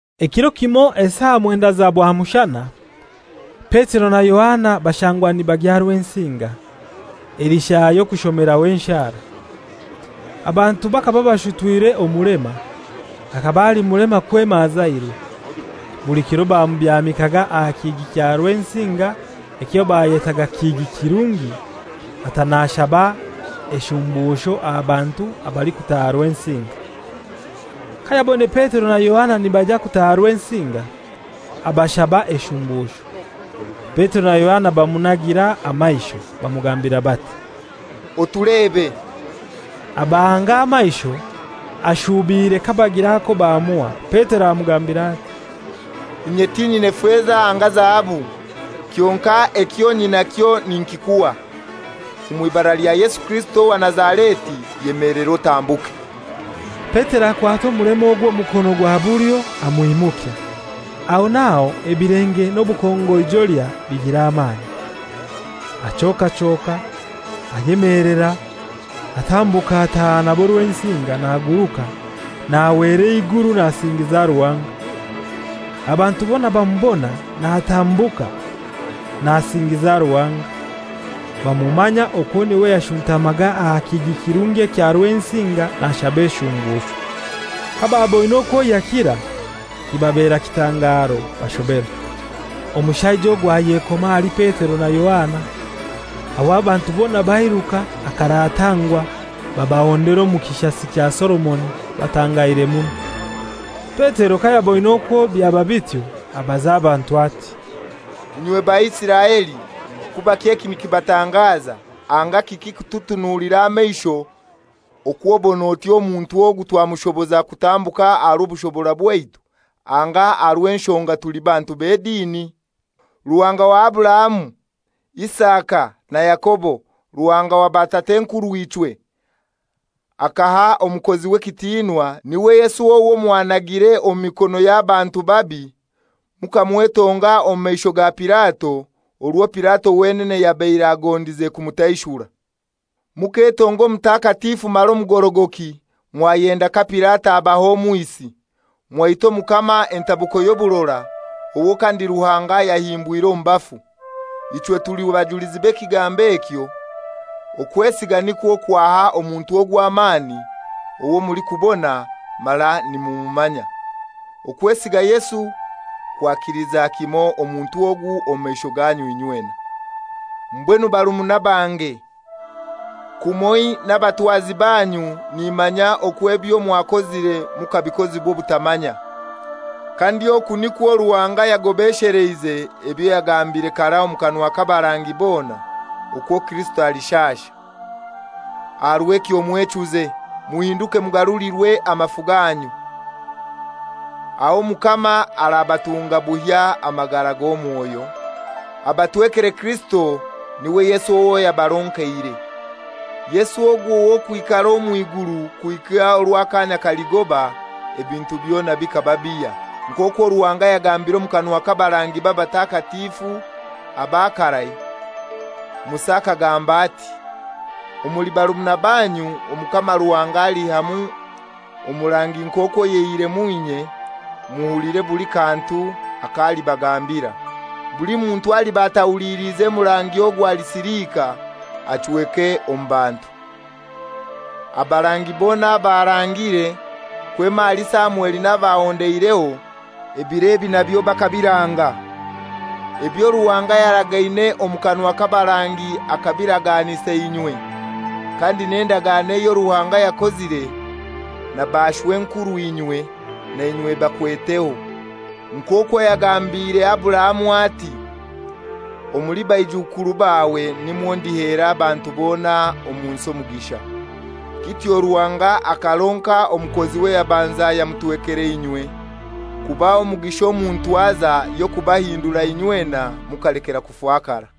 Ekiro kimoi esaa mwendai za bwamushana, Petero na Yohana bashangwa nibagya Rwensinga, eli saa y'okushomeraho enshara. Abantu bakaba bashutwire omulema, akaba ali mulema kwema azairwe, buli kiro bamubyamikaga aha kihigi kya Rwensinga ekyo bayetaga Kihigi Kirungi, ata nashaba eshumbusho aha bantu abalikutaaha Rwensinga. Kayaboine Petero na Yohana nibaija kutaaha Rwensinga, abashaba eshumbusho. Petero na Yohana bamunagira amaisho, bamugambira bati, «Otulebe.» Abahanga amaisho ashuubiire kabagira ako bamuha. Petero amugambira ati, «Inye tinyina feza anga zahabu, kyonkai ekyo nyinakyo ninkikuha: Omw'ibara lya Yesu Kirisito owa Nazareti, yemelera otambuke.» Petero akwata omulema ogwo omukono gwa bulyo amwimukya. Aho n'aho ebilenge n'obukongoijolya bigira amani. Achokachoka, ayemelera, atambuka ataaha nabo Rwensinga, naguruka nahwera eiguru nasingiza Ruhanga. Abantu bona bamubona natambuka nasingiza Ruhanga, bamumanya okwo n'iwe yashuntamaga aha Kihigi Kirungi ekya Rwensinga nashaba eshumbusho. Kababoine okwo yakira kibabera kitangaro, bashoberwa. Omushaija ogwo ayekoma ahali Petero na Yohana; aho abantu bona bairuka akaratangwa babahondera omu Kishasi kya Solomoni batangaire muno. Petero kayaboine okwo byaba bityo, abaza abantu ati, «Inywe Baisiraeli, kubaki eki nikibatangaza, anga kiki kututunuulira amaisho okw'obon'oti omuntu ogu twamushoboza kutambuka aha rw'obushobora bwaitu anga aha rw'enshonga tuli bantu b'edini? Ruhanga wa Aburahamu, Isaka na Yakobo, Ruhanga wa batat'enkurw'ichwe, akaha omukoziwe ekitinwa, n'iwe Yesu owo mwanagire omu mikono y'abantu babi, mukamwetonga omu maisho ga Pilato, orwo Pilato wenene yabaire agondize kumutaishura. Muketonga Omutakatifu mara omugorogoki, mwayenda ka Pilato abaha omwisi, mwaita Omukama entabuko y'oburora, owo kandi Ruhanga yahimbwire omu bafu. Ichwe tuli bajulizi b'ekigambo ekyo. Okwesiga nikwo kwaha omuntu ogu amani owo mulikubona mara nimumumanya. Okwesiga Yesu kwakiliza kimoi omuntu ogu omu maisho ganyu inywena. «Mbwenu barumuna bange, kumoi n'abatwazi banyu, nimanya okwo ebyo mwakozire mukabikozibwa obutamanya. Kandi oku nikwo Ruhanga yagobesheleize ebyo yagambire karai omu kanwa k'abarangi bona okwo Kirisito alishasha. Aha rw'ekyo mwechuze, muhinduke mugarulirwe amafu ganyu. Aho Omukama arabatunga buhya amagara g'omwoyo, abatwekere Kirisito, n'iwe Yesu owo yabaronkeire. Yesu ogu w'okwikara omw'iguru kuhika orwo akaanya kaligoba ebintu byona bikaba bihya, nk'okwo Ruhanga yagambire omu kanwa k'abarangibe abatakatifu aba karai. Musa akagamba ati, ‹Omuli barumuna banyu Omukama Ruhanga aliihyamu omurangi nk'okwo yaihiremu inye muhulire buli kantu ak'alibagambira. Buli muntu aliba atahulilize murangi ogwo alisilika, achweke omu bantu.› Abarangi bona abaarangire, kwema ahali Samweli n'abahondeireho, ebiro ebi nabyo bakabiranga. Ebyo Ruhanga yaragaine omu kanwa k'abarangi akabiraganisa inywe, kandi n'endagano eyo Ruhanga yakozire na bashw'enkurw'inywe na inywe ebakweteho. Nk'okwo yagambire Aburahamu ati, ‹Omuli baijukuru bawe nimwo ndihera abantu bona omu nsi omugisha.› Kityo Ruhanga akaronka omukoziwe yabanza yamutwekera inywe, kubaha omugisha omu ntwaza y'okubahindura inywena mukalekera kufakara.»